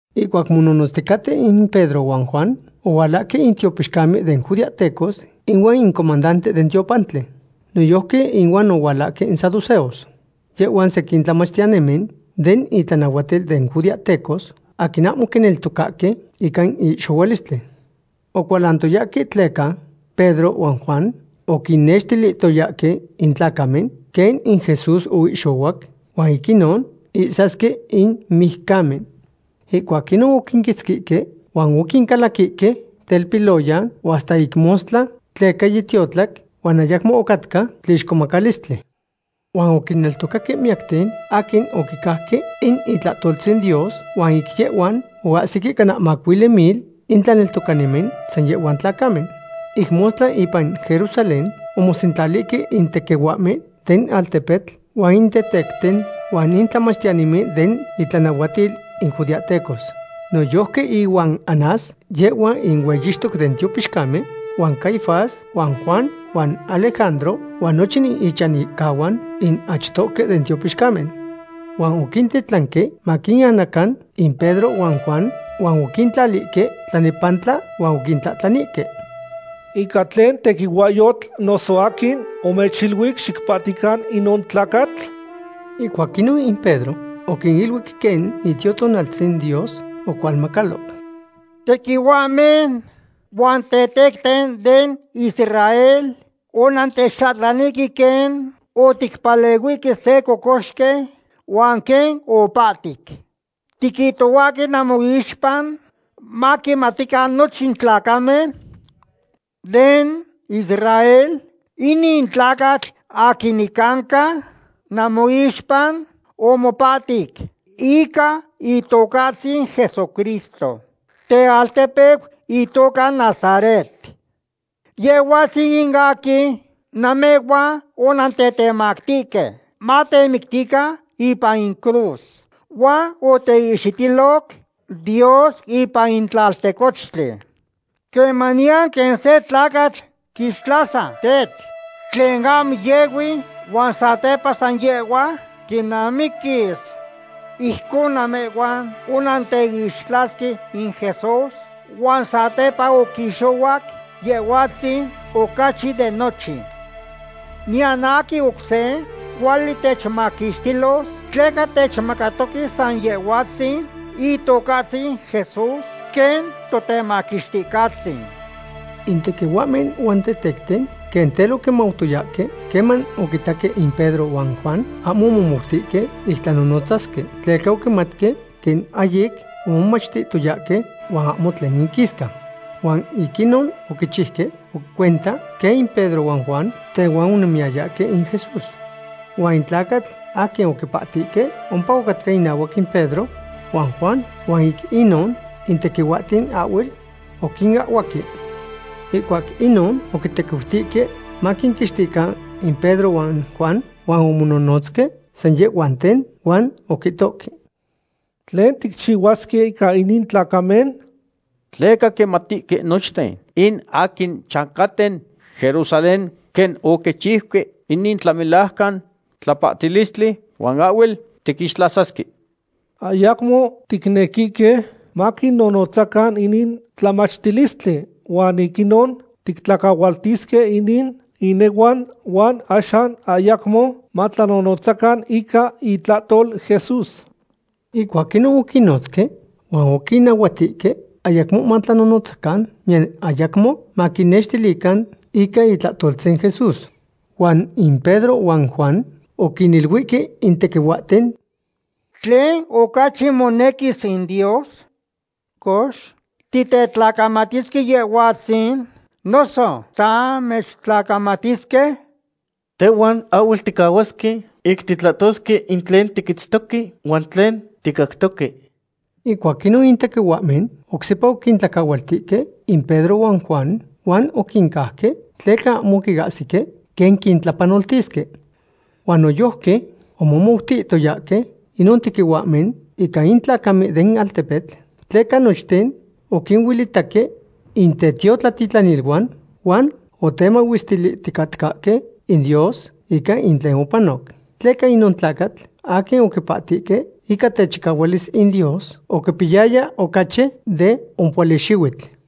Ihcuac mononotzticaten in Pedro huan Juan, ohualahque in tiopixcamen den judeahtecos ihuan in comandante den tiopantli. Noyojqui inuan ohualahque in saduceos. Yehhuan sequin tlamachtiyanimen den itlanahuatil den judeahtecos aquin ahmo oquineltocaque ica in ihxohualistli. Ocualantoyahque tleca Pedro huan Juan oquinnextilihtoyahque in tlacamen quen in Jesús oihxohuac huan ic inon ihsasque in mijcamen. Ihcuac inon oquinquitzquihque huan oquincalaquihque telpiloyan huan hasta ic mostla tleca yitiotlac huan ayacmo ocatca tlixcomacalistli. Huan oquineltocaque miyacten aquin oquicajque in itlahtoltzin Dios huan ic yehhuan oahsic cana macuili mil in tlaneltocanimen san yehhuan tlacamen. Ic mostla ipan Jerusalén omosentlalihque in tequihuahmen den altepetl, huan in tetecten, huan in tlamachtiyanimen den itlanahuatil in judeahtecos. Noyojqui ihuan Anás, yehhua in hueyixtoc den tiopixcamen, huan Caifás huan Juan huan Alejandro huan nochin ichanihcahuan in achtohque den tiopixcamen. Huan oquintitlanque maquinanacan in Pedro huan Juan, huan oquintlalihque tlanepantla huan oquintlahtlanihque: ―¿Ica tlen tequihuahyotl, noso aquin omechiluic xicpahtican inon tlacatl? Ihcuac inon in Pedro oquiniluic quen Itiotonaltzin Dios ocualmacaloc: ―Tequihuahmen huan tetecten den Israel, onantechtlahtlanihque quen oticpalehuihque se cocoxqui, huan quen opahtic. Tiquihtohuahque namoixpa, maquimatican nochin tlacamen den Israel, inin tlacatl aquin nicanca namoixpa omopahtic ica Itocahtzin Jesucristo tealtepeu itoca Nazaret. Yehhuatzin in aquin namehhuan onantetemactihque matemictican ipan in cruz, huan oteihxitiloc Dios ipan in tlaltecochtli. Quemaniyan quen se tlacatl quixtlasa tetl tlen ahmo yehui huan satepa san yehhua quinamiquis. Ijcon namehhuan onanteixtlasque in Jesús, huan satepa oquixohuac Yehhuatzin ocachi de nochin. Niyan aquin oc se cuali techmaquixtilos tleca techmacatoque san Yehhuatzin Itocahtzin Jesús quen Totemaquixticahtzin. In tequihuahmen huan in tetecten quen tel oquimautoyahque queman oquitaque in Pedro huan Juan ahmo omomoutihque ic tlanonotzasque, tleca oquimatque quen ahyic omomachtihtoyahque huan ahmo tlen inquisca. Huan ic inon oquichiuque cuenta quen in Pedro huan Juan tehuan onemiyayahque in Jesús. Huan in tlacatl aquin oquipahtihque ompa ocatca inahuac in Pedro huan Juan, huan ic inon in tequihuahten ahhuel oquinahhuaque. Ihcuac inon oquitequiutihque maquinquixtican in Pedro huan Juan huan omonohnotzque san yehhuanten, huan oquihtoque: ―¿Tlen ticchihuasque ica inin tlacamen? Tleca quimatihque nochten in aquin chancaten Jerusalén quen oquichiuque inin tlamelajcan tlapahtilistli, huan ahhuel tiquixtlasasque. Ayacmo ticnequihque maquinonotzacan inin tlamachtilistli huan ic inon tiquintlacahualtisque inin inehuan huan axan ayacmo matlanonotzacan ica itlahtol Jesús. Ihcuac inon oquinnotzque huan oquinnahuatihque ayacmo matlanonotzacan niyan ayacmo maquinnextilican ica itlahtoltzin Jesús. Huan in Pedro huan Juan oquiniluihque in tequihuahten: ―¿Tlen ocachi monequis in Dios? Cox, ¿titetlacamatisque Yehhuatzin noso tamechtlacamatisque? Tehhuan ahhuel ticahuasque ic titlahtosque in tlen tiquitztoque huan tlen ticactoque. Ihcuac inon in tequihuahmen oc sepa oquintlacahualtihque in Pedro huan Juan huan oquincauque, tleca ahmo ocahsihque quen quintlapanoltisque. Huan noyojqui omomoutiyayahque inon tequihuahmen ica in tlacamen den altepetl, tleca nochten oquinuelitahque in tetiotlatitlaniluan huan otemahuestilihticatcahque in Dios ica in tlen opanoc. Tleca inon tlacatl aquin oquipahtihque ica techicahualis in Dios oquipiyaya ocachi de ompohuali xihuitl.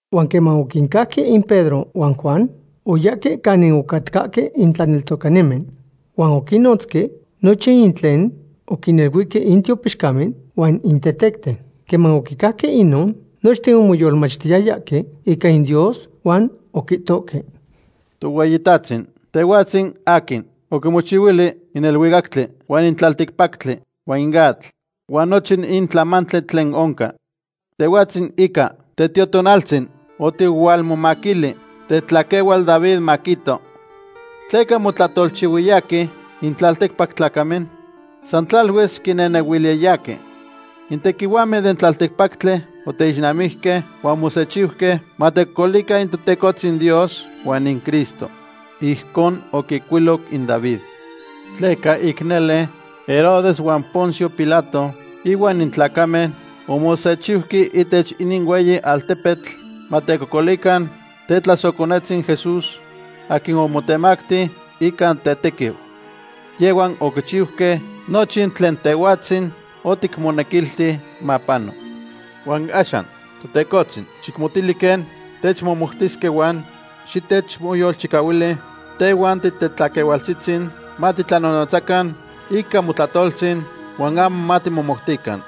Huan queman oquincauque in Pedro huan Juan, oyahque canin ocatcahque in tlaneltocanimen. Huan oquinnotzque nochin in tlen oquiniluihque in tiopixcamen huan in tetecten. Queman oquicajque inon, nochten omoyolmachtiyayahque ica in Dios huan oquihtohque: ―Tohueyitahtzin, Tehhuatzin aquin oquimochihuili in neluicactli huan in tlalticpactli huan in atl, huan nochin in tlamantli tlen oncan. Tehhuatzin ica Tetiotonaltzin oticualmomaquili tetlaquehual David maquihto: ¿Tleca motlahtolchihuiyahque in tlalticpac tlacamen? San tlaluis quinehnehuiliyahque. In tequihuahmen den tlalticpactli oteixnamijque, huan omosechiuque matecocolican in Totecohtzin Dios huan in Cristo. Ijcon oquihcuiloc in David. ’Tleca ic nele, Herodes huan Poncio Pilato, ihuan in tlacamen omosechiuque ihtech inin hueyi altepetl matecocolican tetlasohconetzin Jesús, aquin omotemacti ica tetequiu. Yehhuan oquichiuque nochin tlen Tehhuatzin oticmonequilti mapano. Huan axan, Totecohtzin, xicmotili quen techmohmoutisque huan xitechmoyolchicahuili tehhuan titetlaquehualtzihtzin matitlanonotzacan ica motlahtoltzin huan ahmo matimomoutican.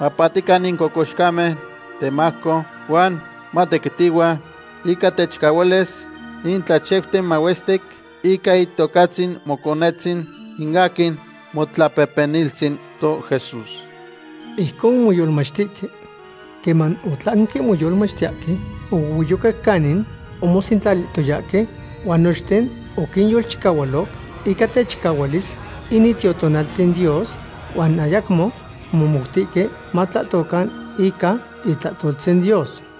Mapahtican in cocoxcamen temajco huan matequitihua ica techicahualis in tlachiuten mahuestic ica Itocatzin Moconetzin, in aquin Motlapehpeniltzin toJesús. Ijcon omoyolmachtihque. Queman otlanque moyolmachtiyahque, ohuehueyocac canin omosentlalihtoyahque huan nochten oquinyolchicahualo ica techicahualis in Itiotonaltzin Dios huan ayacmo omomoutihque matlahtocan ica itlahtoltzin Dios.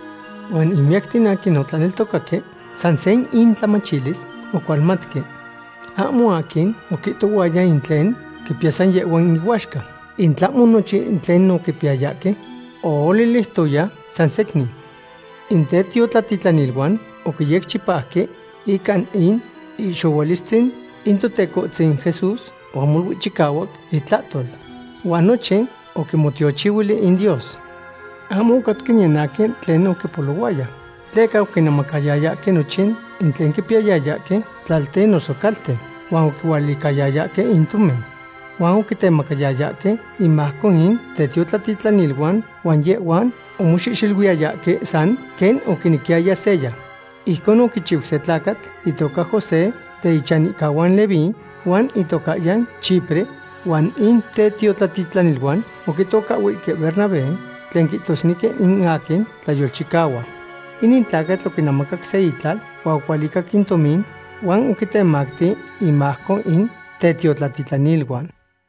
Huan in miyacten aquin otlaneltocaque san se intlamachilis ocualmatque. Ahmo aquin oquihtohuaya in tlen quipiya san yehhua inuaxca, in tlahmo nochin in tlen oquipiyayahque ooliliutoya sansecnin. In tetiotlatitlaniluan oquiyecchipauque ica in ihxohualistzin in Totecohtzin Jesús huan molui chicahuac intlahtol. Huan nochin oquinmotiochihuili in Dios. Ahmo ocatca niyan aquin tlen oquipolohuaya, tleca oquinemacayayahque nochin in tlen oquipiyayahque, tlalten noso calten, huan ocualicayayahque in tomin. Huan oquitemactiyayahque inmajco in tetiotlatitlaniluan huan yehhuan omoxehxeluiyayahque san quen oquinequiyaya seya. Ijcon oquichiu se tlacatl itoca José den ichanihcahuan Leví, huan itocahyan Chipre, huan in tetiotlatitlaniluan oquitocahhuihque Bernabé, tlen quihtosnequi in aquin tlayolchicahua. Inin tlacatl oquinemacac se itlal huan ocualicac in tomin huan oquitemacti inmajco in tetiotlatitlaniluan.